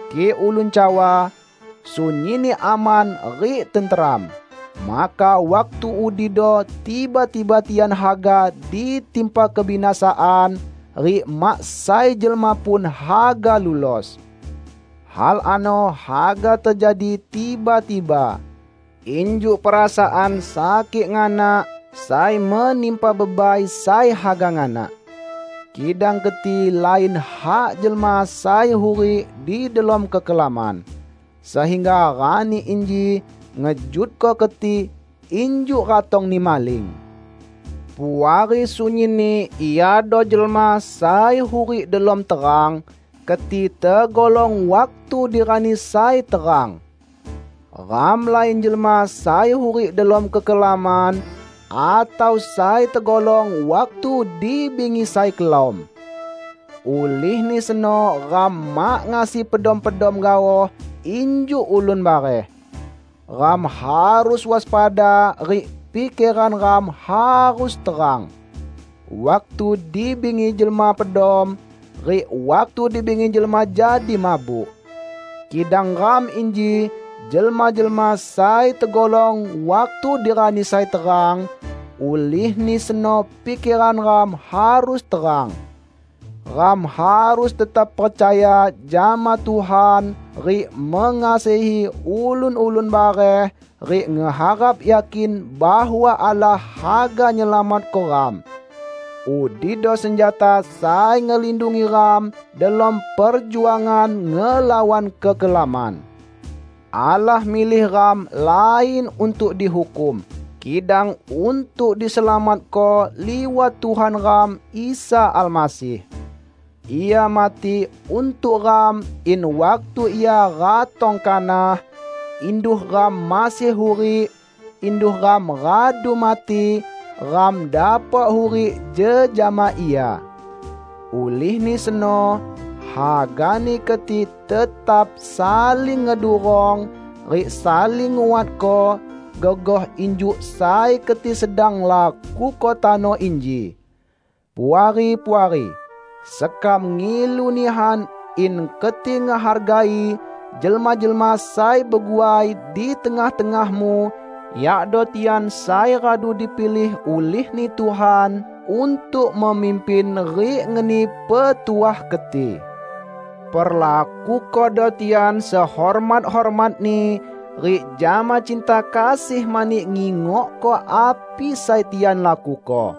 Kik ulun cawa, "Sunyinni aman rik tenteram," maka waktu udido tiba-tiba tian haga ditimpa kebinasaan, rik mak sai jelma pun haga lulos. Hal ano haga tejadi tiba-tiba, injuk perasaan sakik nganak sai menimpa bebai sai haga nganak. Kidang keti lain hak jelma sai hurik di delom kekelaman, sehingga rani inji ngejutko keti injuk ratongni maling. Puari sunyinni iado jelma sai hurik delom terang; keti tegolong waktu di rani sai terang. Ram lain jelma sai hurik delom kekelaman, atau sai tegolong waktu di bingi sai kelam. Ulihni seno ram mak ngasi pedom-pedom gaoh injuk ulun bareh. Ram harus waspada rik pikeran ram harus terang. Waktu di bingi jelma pedom, rik waktu di bingi jelma jadi mabuk. Kidang ram inji jelma-jelma sai tegolong waktu di rani sai terang, ulihni seno pikeran ram harus terang. Ram harus tetap percaya jama Tuhan rik mengasihi ulun-ulun bareh rik ngeharap yakin bahwa Allah haga nyelamatko ram. Udido senjata sai ngelindungi ram delom perjuangan ngelawan kekelaman. Allah milih ram lain untuk dihukum, kidang untuk diselamatko liwat Tuhan ram Isa Almasih. Ia mati untuk ram in waktu Ia ratong kanah -- induh ram masih hurik, induh ram radu mati -- ram dapok hurik jejama Ia. Ulihni seno, hagani keti tetap saling ngedurong rik saling nguatko, gegoh injuk sai keti sedang lakuko tano inji. Puari-puari, sekam ngilu nihan in keti ngehargai jelma-jelma sai beguai di tengah-tengahmu; yakdo tian sai radu dipilih ulih-Ni Tuhan untuk memimpin rik ngeni petuah keti. Perlakukodo tian sehormat-hormatni rik jama cinta kasih mani ngingokko api sai tian lakuko.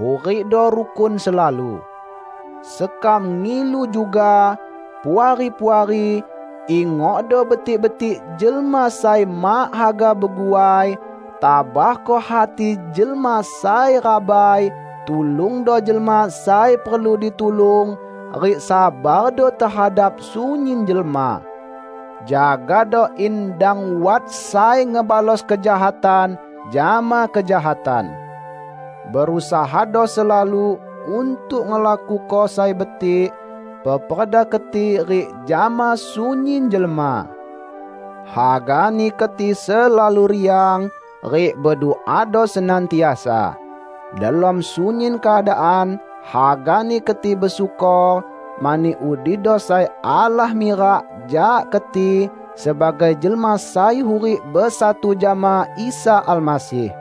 Hurikdo rukun selalu. Sekam ngilu juga, Puari-puari, ingokdo betik-betik jelma sai mak haga beguai; tabahko hati jelma sai rabai; tulungdo jelma sai perlu ditulung rik sabardo tehadap sunyin jelma. Jagado in dang wat sai ngebalos kejahatan jama kejahatan. Berusahado selalu untuk ngelakuko sai betik, peperda keti rik jama sunyin jelma. Hagani keti selalu riang, rik beduado senantiasa. Delom sunyin keadaan hagani keti besyukor, mani udido sai Allah mirak jak keti sebagai jelma sai hurik besatu jama Isa Almasih.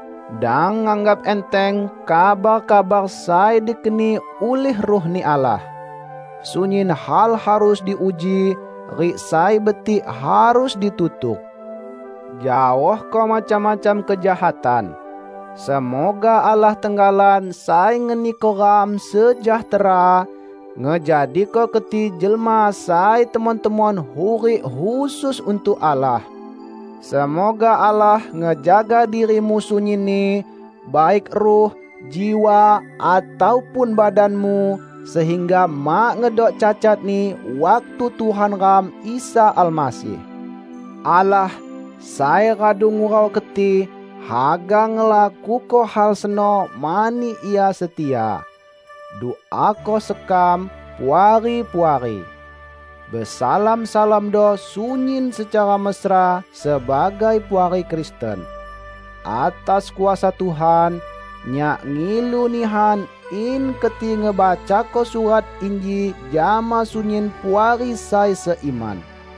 Dang nganggap enteng kabar-kabar sai dikeni ulih Ruh-Ni Allah. Sunyin hal harus diuji, rik sai betik harus ditutuk. Jaohko macam-macam kejahatan. Semoga Allah tenggalan sai ngeniko ram sejahtera, ngejadiko keti jelma sai temon-temon hurik khusus untuk Allah. Semoga Allah ngejaga dirimu sunyinni, baik ruh, jiwa ataupun badanmu, sehingga mak ngedok cacatni waktu Tuhan ram Isa Almasih ratong muloh. Allah, sai radu ngurau keti, haga ngelakuko hal seno mani Ia setia. Duako sekam, Puari-puari. Besalam-salamdo sunyin secara mesra sebagai puari Kristen. Atas kuasa Tuhan, nyak ngilu nihan in keti ngebacako surat inji jama sunyin puari sai seiman.